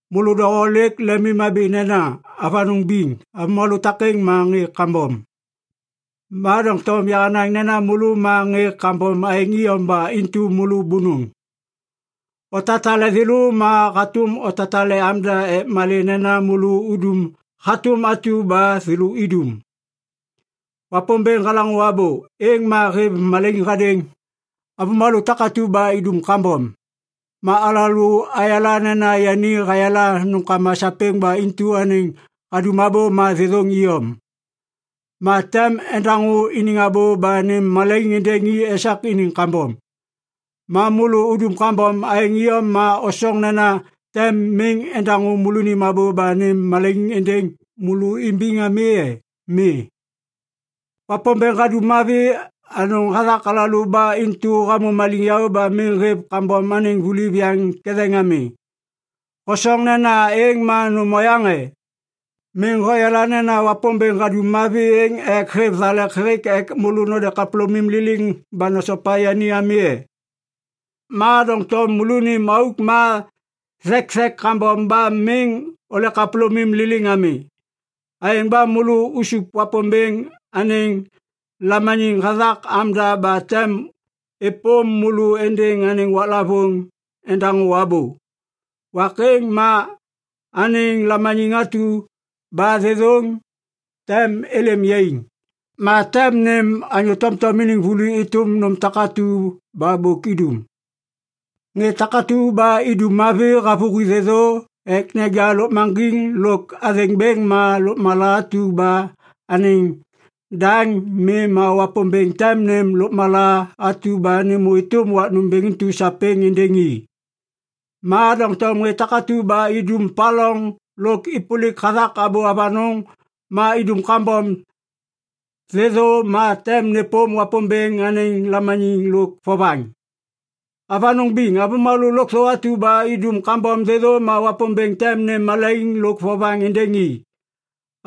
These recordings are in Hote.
Môlô doho lêk lemimhabi nena, “Avanôŋ biŋ, avômalô takêŋ ma ŋê kambom.” Ma doŋtom yahanaŋ nena môlô ma ŋê kambom aêŋ iyom ba intu môlô bônôŋ. Otatale thêlô ma hatôm otatale amda ek malê nena môlô udum hatôm atu ba thêlô idum. Wapômbêŋ halaŋô abô, êŋ ma hêv malaiŋ hadêŋ avômalô takatu ba idum kambom. Ma alalô ayala nena yani hayala nômkama sapêŋ ba intu anêŋ hadum abô ma thêthôŋ iyom. Ma tem endaŋô iniŋ abô ba nêm malaiŋ êndêŋ i esak iniŋ kambom. Ma môlô udum kambom aêŋ iyom ba osoŋ nena tem miŋ endaŋô môlônim abô ba nêm malaiŋ êndêŋ môlô imbiŋ ami e? Mi. Wapômbêŋ hadum mavi anôŋ hathak alalô ba intu hamô maliŋyaô ba miŋ hêv kambom anêŋ vuli viyaŋ ketheŋ ami. Hosoŋ nena êŋ ma nôm oyaŋ e? Miŋ hoyala nena Wapômbêŋ hadum mavi êŋ ek hêv thalek hêk ek môlô node kapôlômim liliŋ ba nosopa yani ami e? Ma doŋtom môlônim auk ma thekthek kambom ba miŋ ole kapôlômim liliŋ ami. Aêŋ ba môlô usup Wapômbêŋ anêŋ lamaniŋ hathak amda ba tem êpôm môlô êndêŋ anêŋ waklavôŋ endaŋô abô. Wak êŋ ma anêŋ lamaniŋ atu ba thêthôŋ tem êlêm yaiŋ. Ma tem nêm anyô tomtom iniŋ vuli êtôm nôm takatu ba bôk idum. Ŋê takatu ba idum mavi havôhi thêthô ek neja lôkmaŋgiŋ lôk athêŋ bêŋ ma lôkmala atu ba anêŋ daŋ mi ma Wapômbêŋ tem nêm lôkmala atu ba nêmô êtôm wak nômbêŋ intu sapêŋ êndêŋ i. Ma doŋtom ŋê takatu ba idum paloŋ lôk êpôlik hathak abô avanôŋ ma idum kambom thêthô ma tem nêpôm Wapômbêŋ anêŋ lamaniŋ lôk vovaŋ. Avanôŋ biŋ, avômalô lôkthô atu ba idum kambom thêthô ma Wapômbêŋ tem nêm malaiŋ lôk vovaŋ êndêŋ i,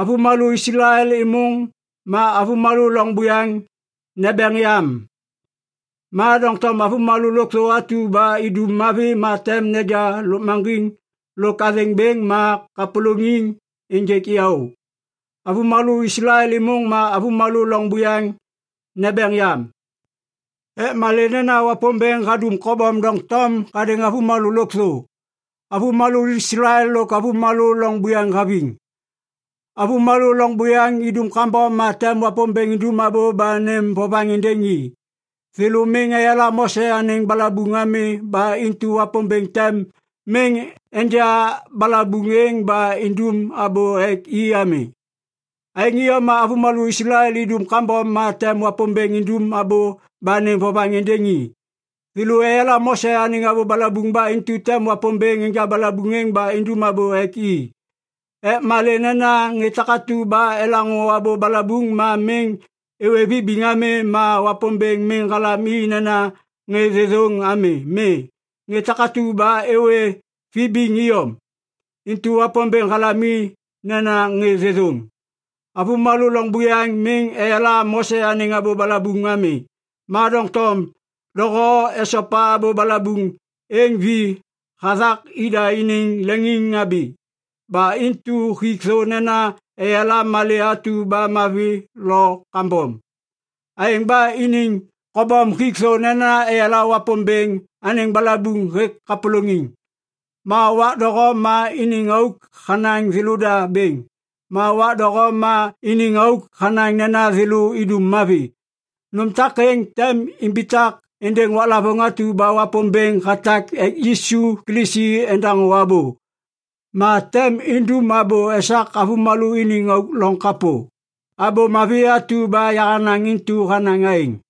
avômalô Islael êmôŋ ma avômalô loŋ buyaŋ nembeŋ yam. Ma doŋtom avômalô lôkthô atu ba idum mavi ma tem neja lôkmaŋgiŋ lôk athêŋ bêŋ ma kapôlôŋiŋ ênjêk yaô, avômalô Islael êmôŋ ma avômalô loŋ buyaŋ nembeŋ yam. Ek malê nena Wapômbêŋ hadum kobom doŋtom hadêŋ avômalô lôkthô, avômalô Islael lôk avômalô loŋ buyaŋ haviŋ. Avômalô loŋ buyaŋ idum kambom ma tem Wapômbêŋ indum abô ba nêm vovaŋ êndêŋ i. Thêlô miŋ eyala Mose anêŋ balabuŋ ami ba intu Wapômbêŋ tem miŋ enja balabuŋ êŋ ba indum abô ek i ami. Aêŋ iyom ma avômalô Islael idum kambom ma tem Wapômbêŋ indum abô ba nêm vovaŋ êndêŋ i. Thêlô eyala Mose anêŋ balabuŋ ba intu tem Wapômbêŋ enja balabuŋ êŋ ba indum abô ek i. Ek malê nena ŋê takatu ba elaŋô abô balabuŋ ma miŋ êwê vibiŋ ami ma Wapômbêŋ miŋ halam i nena ŋê thêthôŋ ami. Mi, ŋê takatu ba êwê vibiŋ iyom, intu Wapômbêŋ halam i nena ŋê thêthôŋ. Avômalô loŋ buyaŋ miŋ eyala Mose anêŋ abô balabuŋ ami, ma doŋtom doho esopa abô balabuŋ êŋ vi hathak ida iniŋ leŋiŋhabi. Ba intu hik thô nena eyala malê atu ba mavi lo kambom. Aêŋ ba iniŋ kobom hik thô nena eyala Wapômbêŋ anêŋ balabuŋ hêk kapôlôŋiŋ. Ma wak doho ma iniŋ auk hanaŋ thêlôda bêŋ, ma wak doho ma iniŋ auk hanaŋ nena thêlô idum mavi. Nôm takêŋ tem imbitak êndêŋ waklavôŋ atu ba Wapômbêŋ hatak ek Yisu Kilisi endaŋô abô. Ma tem indum abô esak avômalô iniŋ auk loŋ kapô. Abô Mavi atu ba yahanaŋ intu hanaŋ aêŋ.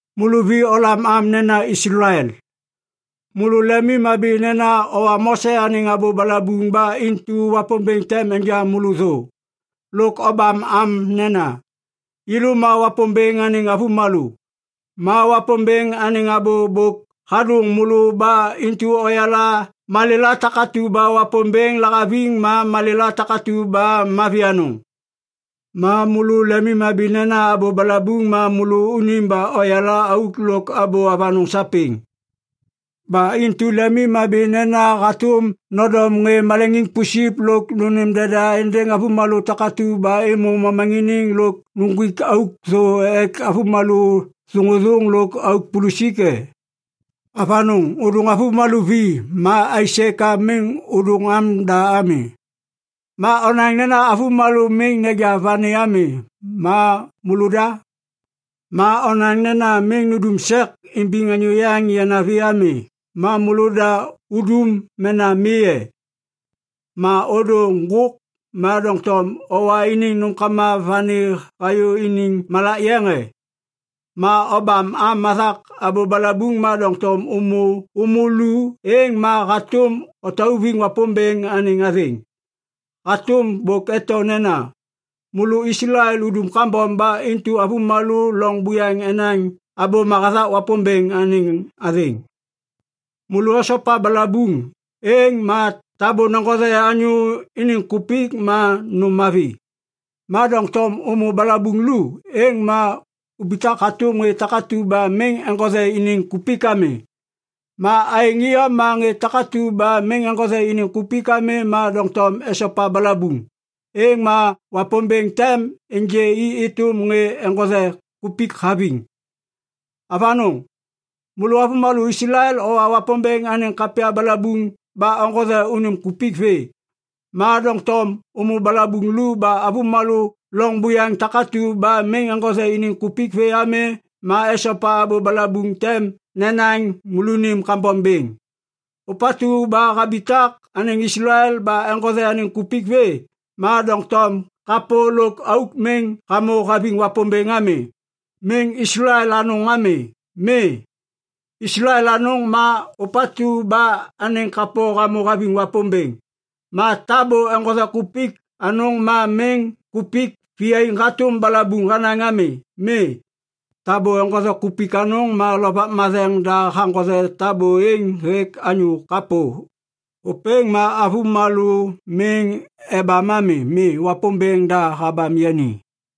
Môlô vi olam am nena Islael. Môlô lemimhabi nena owa Mose anêŋ abô balabuŋ ba intu Wapômbêŋ tem enja môlô thô. Lôk obam am nena, “Yêlô ma Wapômbêŋ anêŋ avômalô.” Ma Wapômbêŋ anêŋ abô bôk hadôŋ môlô ba intu oyala malêla takatu ba Wapômbêŋ lahaviŋ ma malêla takatu ba mavi anôŋ. Ma môlô lemimhabi nena abô balabuŋ ma môlô unim ba oyala auk lôk abô avanôŋ sapêŋ. Ba intu lemimhabi nena hatôm nondom ŋê maleŋiŋ pusip lôk nônêm deda êndêŋ avômalô takatu ba êmô momaŋiniŋ lôk uŋgwik auk thô ek avômalô auk thôŋôthôŋ lôk auk pulusik e? Avanôŋ, ôdôŋ avômalô vi, ma aisê ka miŋ ôdôŋ amda ami? Ma onaŋ nena avômalô miŋ neja vani ami. Ma môlôda? Ma onaŋ nena miŋ nindum sek imbiŋ anyô yaŋ yanavi ami, ma môlôda udum mena mi e? Ma ôdô ŋgôk, ma doŋtom owa iniŋ nômkama vani hayô iniŋ malak matheŋ e? Ma obam am hathak abô balabuŋ ma doŋtom ômô lu êŋ ma hatôm otauviŋ Wapômbêŋ anêŋ athêŋ. Hatôm bôk eto nena, “Môlô Islael udum kambom ba intu avômalô loŋ buyaŋ enaŋ abôma hathak Wapômbêŋ anêŋ athêŋ.” Môlô osopa balabuŋ, êŋ ma tabô neŋgothe anyô iniŋ kupik ma nôm mavi. Ma doŋtom ômô balabuŋ lu, êŋ ma ubitak hatôm ŋê takatu ba miŋ eŋgothe iniŋ kupik ami. Ma aêŋ iyom ma ŋê takatu ba miŋ eŋgothe iniŋ kupik ami ma doŋtom esopa balabuŋ, êŋ ma Wapômbêŋ tem ênjê i êtôm ŋê eŋgothe kupik haviŋ. Avanôŋ, môlô avômalô Islael owa Wapômbêŋ anêŋ kapya balabuŋ ba oŋgothe unim kupik vê. Ma doŋtom ômô balabuŋ lu ba avômalô loŋ buyaŋ takatu ba miŋ eŋgothe iniŋ kupik vê ami ma esopa abô balabuŋ tem nenaŋ môlônim kambom bêŋ. Ôpatu ba habitak anêŋ Islael ba eŋgothe anêŋ kupik vê, ma doŋtom kapô lôk auk miŋ hamô haviŋ Wapômbêŋ ami, miŋ Islael anôŋ ami. Mi, Islael anôŋ ma ôpatu ba anêŋ kapô hamô haviŋ Wapômbêŋ. Ma tabô eŋgothe kupik anôŋ ma miŋ kupik viyaiŋ hatôm balabuŋ hanaŋ ami. Mi, tabô eŋgothe kupik anôŋ ma Lovak Matheŋ da haŋgothe tabô êŋ hêk anyô kapô. Ôpêŋ ma avômalô miŋ ebam ami. Mi, Wapômbêŋ da habam yani.